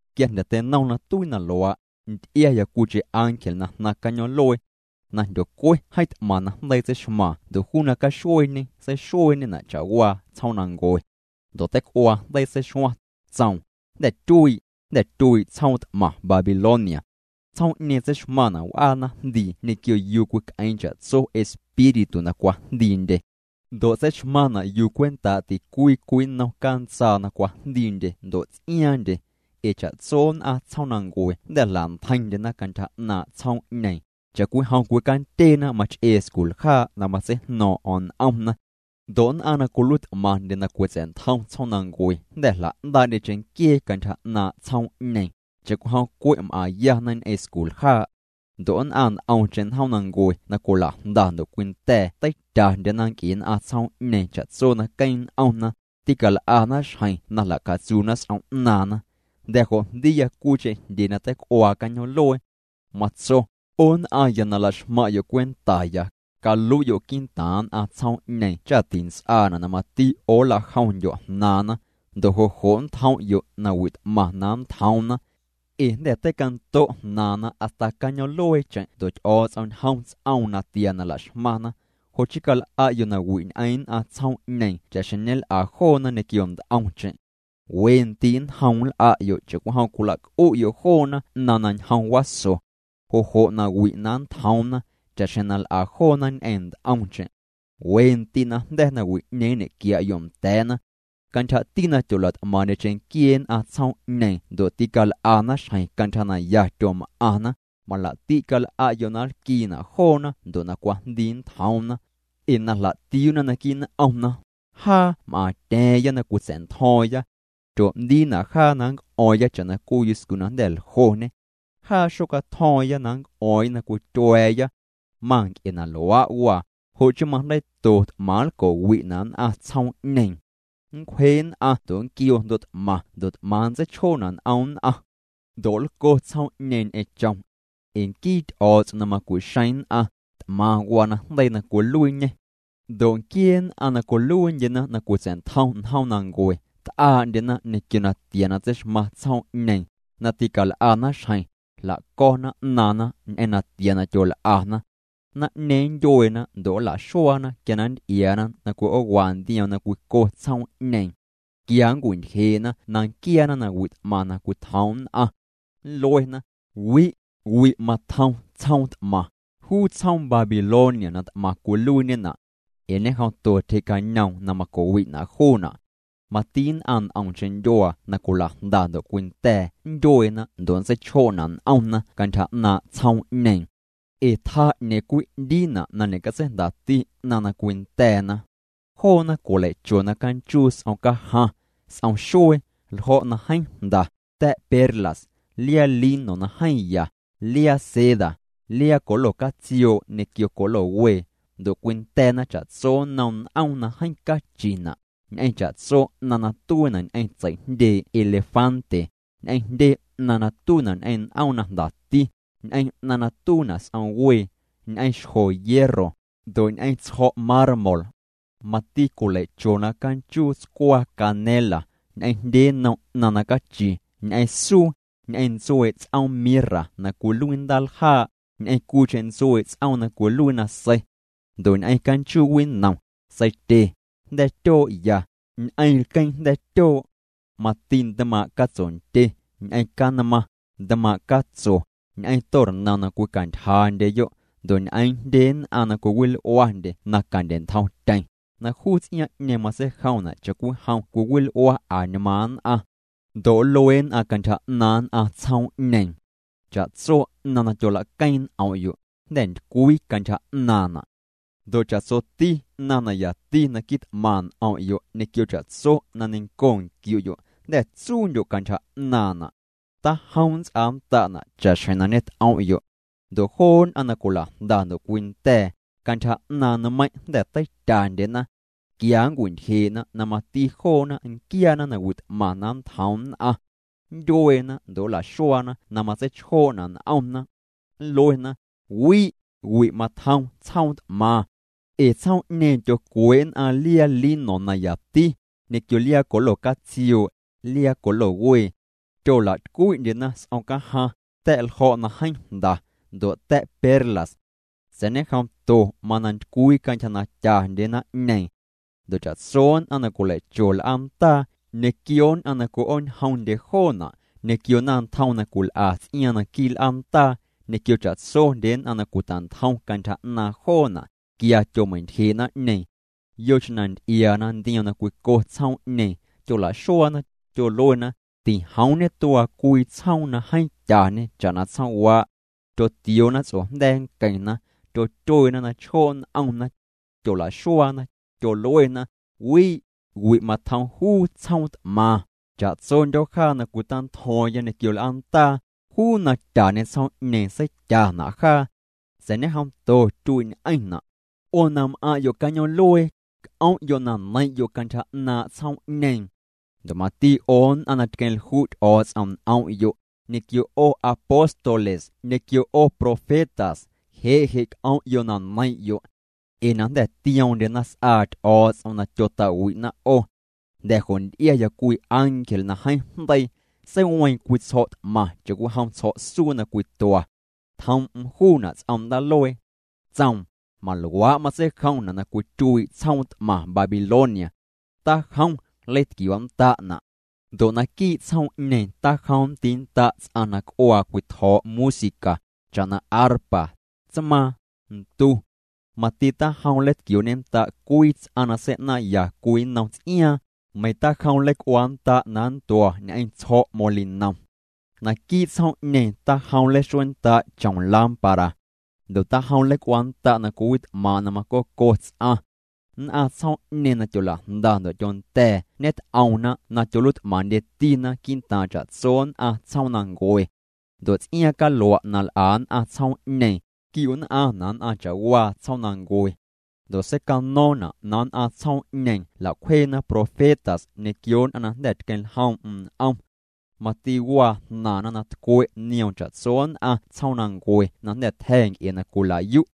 Quia jnda̱ teinom na tuii na luaa', nty'iaya cwiicheⁿ ángel na jnaⁿ cañoom'luee na jndyocue. Jeeⁿ t'maⁿ najndeii tseixmaaⁿ ndo' juu na caxueeñê seixueeñena' cha'waa tsjoomnancue. Ndo' teic'uaa jndeii seixuaⁿ, tsoom: —Jnda̱ tyuii', jnda̱ tyuii' tsjoom t'maⁿ Babilonia. Tsjoom'ñeeⁿ tseixmaⁿna' w'aa naⁿjndii ñequio yuu cwic'eeⁿ cha'tso espíritu na cwajndiindye. Ndo' tseixmaⁿna' yuu cwentaa' ticwii cwii nnom cantsaa na cwajndiindye ndo' ts'iaaⁿndye. Ee cha'tso nn'aⁿ tsjoomnancue jnda̱ jla'ntjeiⁿndyena cantyja 'naaⁿ' tsjoom'ñeeⁿ, cha'cwijom cwicandyeena mach'ee sculjaa' na matseijno̱o̱ⁿ'o̱ⁿ n'omna. Ndo' nn'aⁿ na cwiluiit'maⁿndye na cwitsa̱'ntjom tsjoomnancue jnda̱ jla'ndaa'ndye cheⁿnquiee cantyja 'naaⁿ' tsjoom'ñeeⁿ, cha'cwijom cwe' m'aⁿyana ñ'eⁿ sculjaa'. Ndo' nn'aⁿ nt'omcheⁿ njoomnancue na cwila'jnda ndo' cwinda̱a̱ teityandyena nc'e nn'aⁿ tsjoom'ñeeⁿ cha'tso na queeⁿ n'omna, tîcal'ana xjeⁿ na jla'catsuuna s'om 'naaⁿna. Jnda̱ jo' jndiiya cwiicheⁿ jndyee na teic'uaa cañoom'luee. Matso: —'O nn'aⁿya na la'xmaⁿ'yo' cwentaya, calui'yo' quii'ntaaⁿ nn'aⁿ tsjoom'ñeeⁿ cha tints'aana' na mati 'o nla'jomndyo' jnaaⁿna, ndo' jo' jo' nntjom'yo' nawi' t'maⁿ na nntjoomna. Ee jnda̱ teicanto' jnaaⁿna hasta cañoom'lueecheⁿ ndo' Ty'o̱o̱ts'om ñjom ts'oom natia na la'xmaⁿna. Jo' chii cal'a'yo' nawi' ñ'eⁿ nn'aⁿ tsjoom'ñeeⁿ cha'xjeⁿ ñel'a joona ñequio nt'omcheⁿ. We ndii' nnjoom nl'a'yo' cha'cwijom cwila'c'u'yo' joona 'naⁿ na ñjom waso, jo' jo' nawi' na nntjoomna, cha'xjeⁿ na l'a joona ñ'eⁿ nt'omcheⁿ. We ndii' najnda̱ nawi'ñeeⁿ nñe'quia'yo' nda̱a̱na. Cantyjati na tyola't'maaⁿ'ndye cheⁿnquiee nn'aⁿ tsjoom'ñeeⁿ ndo' tical'ana xjeⁿ cantyja na ya tyom'aⁿna, malaa'ti' cal'a'yo' na nlquiina' joona ndo' na cwajndii nntjoomna. Ee na jla'tiuuna naquii' n'omna: “Jaa m'aaⁿtya̱a̱ⁿya na cwitsa̱'ntjo̱o̱ⁿya. Tyoo'ndiina' jaa na nnc'o̱o̱ⁿya cha'na cwii yuscu na jnda̱ ljoñe. Jaa xocatjo̱o̱ⁿya na nnc'o̱o̱ⁿya na cwityua̱a̱ya.” Manc'e na luaa' waa, jo' chii majndeiito t'maⁿ nlco'wi'na' nn'aⁿ tsjoom'ñeeⁿ. Nncwje nn'aⁿ ndo' nnquioo jndo' t'maⁿ ndo' t'maⁿ nntseichjoo'na' n'om nn'aⁿ. Ndo' nlco tsjoom'ñeeⁿ ñ'eⁿ chom. Ee nquii Ty'o̱o̱ts'om na macu'xeeⁿ nn'aⁿ, t'maⁿ waa najndeii na cwiluiiñê. Ndo' nquiee nn'aⁿ na cwiluiindyena na cwitsa̱'ntjom njoomnancue, t'aa'ndyena ñequio natia na tseixmaⁿ tsjoom'ñeeⁿ, na tîcal'ana xjeⁿ, jla'co̱na 'naaⁿna ñ'eⁿ natia na tyol'ana. Naⁿ'ñeeⁿ nntyueena ndo' nla'xuaana quia na nnty'iaana na cwi'oowa ndioom na cwico tsjoom'ñeeⁿ. Tquia nncwintyjee'na na nquiaana nawi' t'maⁿ na cwitjoom nn'aⁿ. Nluena: —Wi', wi' matjom tsjoom t'maⁿ, juu tsjoom Babilonia na t'maⁿ cwiluiiñena'. Ee ñejomto tyjee'cañoom na macowi'na' juuna'. Mati nn'aⁿ nt'omcheⁿ ndyuaa na cwila'jnda ndo' cwinda̱a̱ nntyueena ndo' nntseichjoo'na' n'omna cantyja 'naaⁿ' tsjoom'ñeeⁿ. Ee tjaa 'ñeeⁿ cwii 'ndiina' na ñe'catseijndati 'naⁿ na cwinda̱a̱na. Joona cwilei'chona canchuu s'omcajaⁿ, s'omxuee, ljo̱' na jeeⁿ jnda, ta̱' perlas, liaa lino na jeeⁿ ya, liaa seda, liaa colo catsioo' ñequio colo wee. Ndo' cwinda̱a̱na cha'tso nnom n'oom na jeeⁿ cachina', ñ'eⁿ cha'tso 'naⁿ na tuiina' ñ'eⁿ tsei'jndyee' elefante, ñ'eⁿ jndye 'naⁿ na tuiina' ñ'eⁿ n'oom na jndati, ñ'eⁿ 'naⁿ na tuiina' s'omwee, ñ'eⁿ xjo hierro, ndo' ñ'eⁿ tsjo̱' mármol. Mati cwilei'chona canchuu tscwaa canela, ñ'eⁿ jndye nnom 'naⁿ na cachi, ñ'eⁿ suu, ñ'eⁿ ntsuee' ts'oom mirra na cwiluii ndaaljaa', ñ'eⁿ cwiicheⁿ ntsuee' ts'oom na cwiluii nasei. Ndo' ñ'eⁿ canchuu winom, seitye, jnda̱a̱ tyoo' ya, ñ'eⁿ lqueeⁿ jnda̱a̱ tyoo'. Mati ntmaaⁿ' catsondye, ñ'eⁿ canmaⁿ, ntmaaⁿ' catso, ñ'eⁿ tornom na cwicantyjandyeyo', ndo' ñ'eeⁿ jndye nn'aⁿ na cwiwil'uandye na candye'ntjomtyeⁿ, na juu ts'iaaⁿ'ñeeⁿ matseijomna' cha'cwijom cwiwil'ua añmaaⁿ nn'aⁿ. Ndo' nlue nn'aⁿ cantyja 'naaⁿ nn'aⁿ tsjoom'ñeeⁿ: —Cha'tso 'naⁿ na tyolaqueeⁿ n'om'yo', jnda̱ ntycwii cantyja 'naaⁿna'. Ndo' cha'tsoti 'naⁿ na yati na quit'maⁿ n'om'yo' ñequio cha'tso na neiⁿnco nquiu'yo', jnda̱ tsuundyo' cantyja 'naaⁿna'. Tajom nnts'aannda'na' cha'xjeⁿ na ñet'om'yo'. Ndo' joo nn'aⁿ na cwila'jnda ndo' cwinda̱a̱, cantyja 'naaⁿ nmeiⁿ' jnda̱ teityandyena. Tquia nncwi'ntyjee'na na mati joona nquiaana nawi' t'maⁿ na nntjoom nn'aⁿ. Nntyueena ndo' nla'xuaana na matseichjoo'na' n'omna. Nluena: —Wi', wi' matjom tsjoom t'maⁿ. Ee tsjoom'ñeeⁿ tyocwee' nn'aⁿ liaa lino na yati, ñequio liaa colo catsioo', liaa colo wee. Tyola'tycwi'ndyena s'om cajaⁿ, ta̱' ljo̱' na jeeⁿ jnda, ndo' ta̱' perlas. Sa̱a̱ ñejomto mana ntycwii cantyja na tyandye naⁿ'ñeeⁿ. Ndo' cha'tso nn'aⁿ na cwilei'cho l'aandaa, ñequio nn'aⁿ na cwi'ooñjomndye joona', ñequio naⁿntjom na cwil'a ts'iaaⁿ naquii' l'aandaa, ñequio cha'tsondye nn'aⁿ na cwita'ntjom cantyja 'naaⁿ joona', tquia tyomei'ntyjee' naⁿ'ñeeⁿ. Yocheⁿ na nty'iaana ndioom na cwico tsjoom'ñeeⁿ, tyola'xuaana, tyoluena: —Tijoom ñetuaa cwii tsjoom na jeeⁿ tyañe cha'na tsjoomwaa'. Tyotioona ts'ojnda̱a̱ nqueⁿna, tyotyueena na chjoo' n'omna. Tyola'xuaana, tyoluena: —Wi', wi' matjom juu tsjoom t'maⁿ. Cha'tsondyo̱ jaa na cwita'ntjo̱o̱ⁿya ñequio l'aandaa, juu na tyañe tsjoom'ñeeⁿ seityana' jaa. Sa̱a̱ ñejomto tyuii'ñ'eⁿna'. 'O na m'aⁿ'yo' cañoom'luee, c'om'yo' na neiⁿ'yo' cantyja 'naaⁿ' tsjoom'ñeeⁿ. Ndo' mati 'o nn'aⁿ na tqueⁿlju' Ty'o̱o̱ts'om n'om'yo', ñequio 'o apóstoles ñequio 'o profetas, je' je' c'om'yo' na neiⁿ'yo'. Ee na jnda̱ tioomndyena s'aa Ty'o̱o̱ts'om na tyota'wi'na 'o. Jnda̱ jo' nty'iaya cwii ángel na jeeⁿ jndeii, seiweeⁿ cwii tsjo̱' t'maⁿ cha'cwijom tsjo̱'suu na cwitua. Tjoom'm juuna' ts'om ndaaluee. Tsoom: —Maluaa' matseijomna' na cwityuii' tsjoom t'maⁿ Babilonia. Tajom nleitquioo'nnda'na'. Ndo' naquii' tsjoom'ñeeⁿ tajom nndiinnda' ts'aⁿ na c'uaa cwitjo̱o̱' música, cha'na arpa, tsmaaⁿ, ntu. Mati tajom nleitquioo'ñennda' cwii ts'aⁿ na sei'naaⁿ'ya cwii nnom ts'iaaⁿ, meiⁿ tajom nleic'uaannda' na nntua ñ'eⁿ tsjo̱'molinom. Naquii' tsjoom'ñeeⁿ tajom nleixueennda' chom lámpara. Ndo' tajom nleic'uaannda' na cwiwit'maaⁿ' na macoco ts'aⁿ. Nn'aⁿ tsjoom'ñeeⁿ na tyola'jnda ndo' tyonda̱a̱ ñet'oomna' na tyoluiit'maⁿndyetina quii'ntaaⁿ cha'tso nn'aⁿ tsjoomnancue. Ndo' ts'iaaⁿ calua' na l'a nn'aⁿ tsjoom'ñeeⁿ, tquiu'nn'aⁿna' nn'aⁿ cha'waa tsjoomnancue. Ndo' seicano̱o̱ⁿna' na nn'aⁿ tsjoom'ñeeⁿ jla'cwjeena profetas ñequio nn'aⁿ na jnda̱ tqueⁿljoom'm n'om. Mati waa jnaaⁿna na tcwe' nioom cha'tso nn'aⁿ tsjoomnancue na jnda̱ tja̱ nc'e na cwila'yu'.